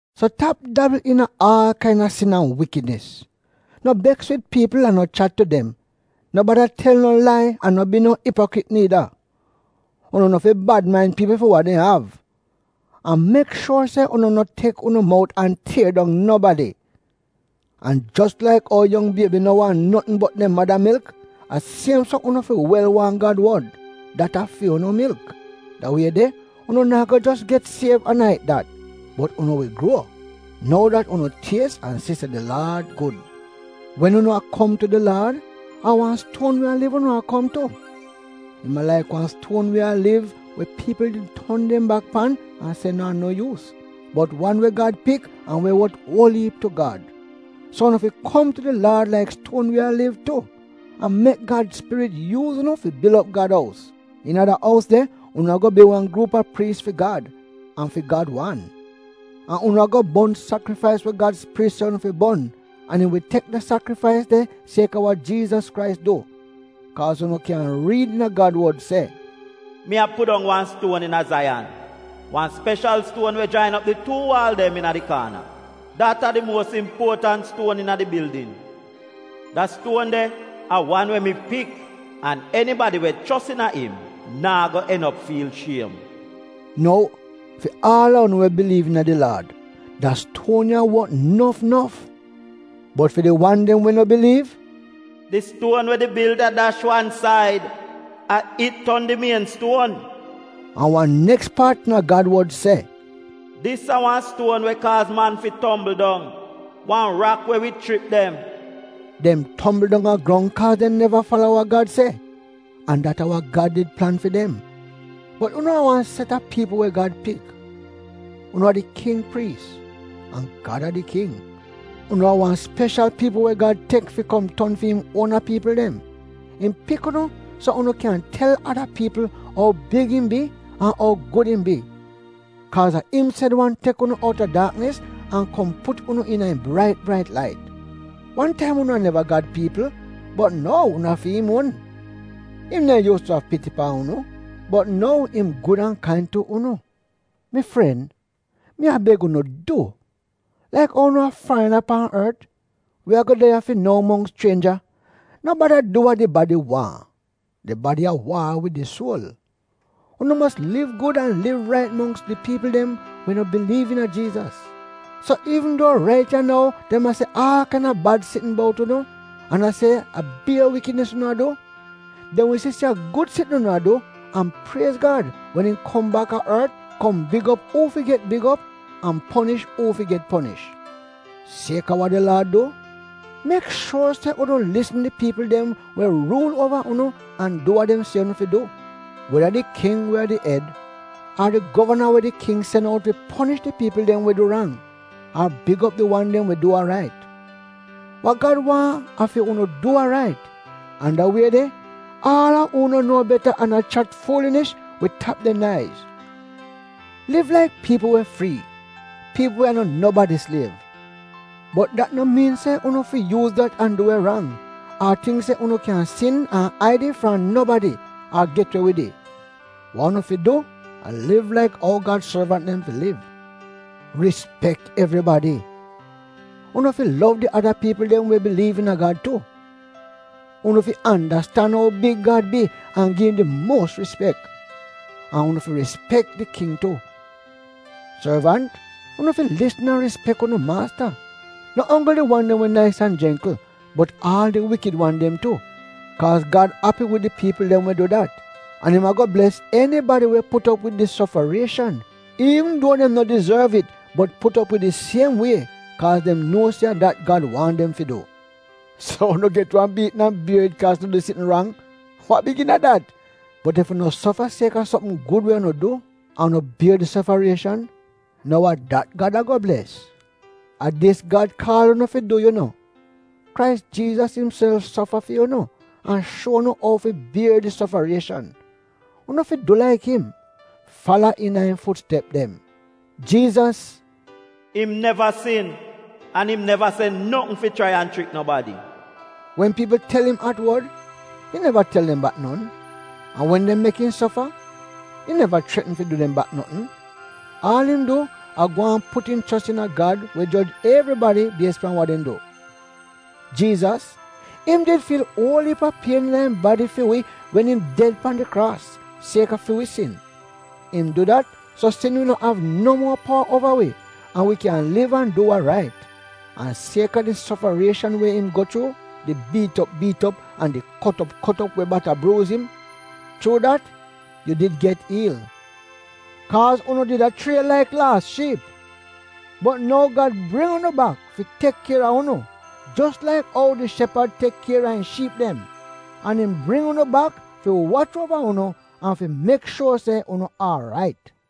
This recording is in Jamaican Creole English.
So tap dabl iina aal kain-a sin an wikidnis. No beks wid piipl an no chat tu dem, no bada tel no lai an no bi no ipokrit niida. Unu no fi bad main piipl fi we dem av. An mek shuor se unu no tek unu mout an tier dong nobadi. An jos laik ou yong biebi no waahn notn bot dem mada milk, a siem so unu fi wel waahn Gad wod — dat a fi unu milk. Da wie de, unu naa go jos get siev an a it dat, bot unu wi gruo, nou dat unu “ties an si se di Laad gud.” Wen unu a kom tu di Laad, a wan stuon we a liv unu a kom tu. Im a laik wan stuon we a liv we piipl did ton dem bak pan an se naa no yuus, bot wan we Gad pik an we wot uol iip tu Gad. So unu fi kom tu di Laad laik stuon we a liv tu. An mek Gad Spirit yuuz unu fi bil op Gad ous. Iina da ous de unu a-go bi wan gruup a priis fi Gad — an fi Gad wan. An unu a-go bon sakrifais we Gad Spirit se unu fi bon, an im wi tek da sakrifais de siek-a wa Jiizas Krais du. Kaaz unu kyan riid iina Gad wod se, “Mi a pudong wan stuon iina Zaiyan, wan speshal stuon we jain op di tuu waal dem iina di kaana — dat a di muos impuotant stuon iina di bildin. Da stuon de a wan we mi pik. An enibadi we chos iina im, naa go en op fiil shiem.” Nou, fi aal a unu we biliiv iina di Laad, da stuon ya wot nof nof. Bot fi di wan dem we no biliiv, “Di stuon we di bilda dash wan said — a it ton di mien stuon,” an wan neks paat iina Gad wod se, “Dis a wan stuon we kaaz man fi tombl dong — wan rak we wi chrip dem.” Dem tombl dong a grong kaa dem neva fala wa Gad se. An dat a wa Gad did plan fi dem. Bot unu a wan set a piipl we Gad pik. Unu a di king priis — an Gad a di king. Unu a wan speshal piipl we Gad tek fi kom ton fi im uona piipl dem. Im pik unu so unu kyan tel ada piipl ou big im bi an ou gud im bi. Kaaz a im sed wan tek unu outa daaknis an kom put unu iina im brait brait lait. Wan taim unu a neva Gad piipl bot nou unu a fi im uon. Im neehn yuus tu av piti pan unu bot nou im gud an kain tu unu. Mi fren, mi a beg unu du, laik ou unu a farina pan ort, we a-go de ya fi nou mongks chrienja, no bada du wa di badi waahn — di badi a waar wid di suol. Unu mos liv gud an liv rait mongks di piipl dem we no biliiv iina Jiizas, so iivn duo rait ya nou dem a se aal kain-a bad sitn bout unu, an a se a bier wikidnis unu du, dem wi si se a gud sitn unu a du an priez Gad wen im kom baka ort kom big op uu fi get big op an ponish uu fi get ponish. Siek-a wa di Laad du, mek shuor se unu lisn di piipl dem we ruul uova unu an du wa dem se unu fi du, weda di king we a di ed, ar di govana we di king sen out fi ponish di piipl dem we du rang, ar big op di wan dem we du wa rait. Wa Gad waahn a fi unu du wa rait, an da wie de aal a uu no nuo beta an a chat fuulinish wi tap dem naiz. Liv laik piipl we frii, piipl we a no no nobadi sliev. Bot dat no miin se unu fi yuuz dat an du we rang, ar tingk se unu kyan sin an aid it fram nobadi ar get we wid it. Wa unu fi du, a liv laik ou Gad sorvant dem fi liv. Rispek evribadi. Unu fi lov di ada piipl dem we biliiv iina Gad tu. Unu fi andastan ou big Gad bi an gi im di muos rispek. An unu fi rispek di king tu. Sorvant, unu fi lisn an rispek unu maasta, no onggl di wan dem we nais an jengkl, bot aal di wikid wan dem tu, kaaz Gad api wid di piipl dem we du dat. An im a-go bles enibadi we put op wid di sofarieshan, iivn duo dem no dizorv it bot put op wid it siem wie kaaz dem nuo se a dat Gad waahn dem fi du. So unu get wan biitn an unu bier it kaaz unu du sitn rang. Wa big iina dat? Bot ef unu sofa siek-a sopm gud wa unu du, an unu bier di sofarieshan, nou a dat Gad a-go bles. A dis Gad kaal unu fi du yu no. Krais Jiizas imself sofa fi unu, an shuo unu ou fi bier di sofarieshan. Unu fi du laik im; fala iina im fut step dem. Jiizas, “im neva sin, an im neva se notn fi chrai an chrik nobadi.” Wen piipl tel im at-wod im neva tel dem bak non. An wen dem mek im sofa, im neva chretn fi du dem bak notn. Aal im du a gwaan put im chos iina Gad we joj evribadi bies pan wa dem du. Jiizas — im did fiil uol iip a pien iina im badi fi wi wen im did de pan di kraas siek-a fi wi sin. Im du dat so sin wi no av no muo powa uova wi, an wi kyan liv an du wa rait. An siek-a di sofarieshan we im go chuu: di biit op biit op an di kot op kot op we bata bruuz im, chuu dat yu did get iil. Kaaz unu did a chrie laik laas shiip, bot nou Gad bring unu bak fi tek kier a unu, jos laik ou di shepad tek kier a im shiip dem. An im bring unu bak fi wach uova unu an fi mek shuor se unu aarait.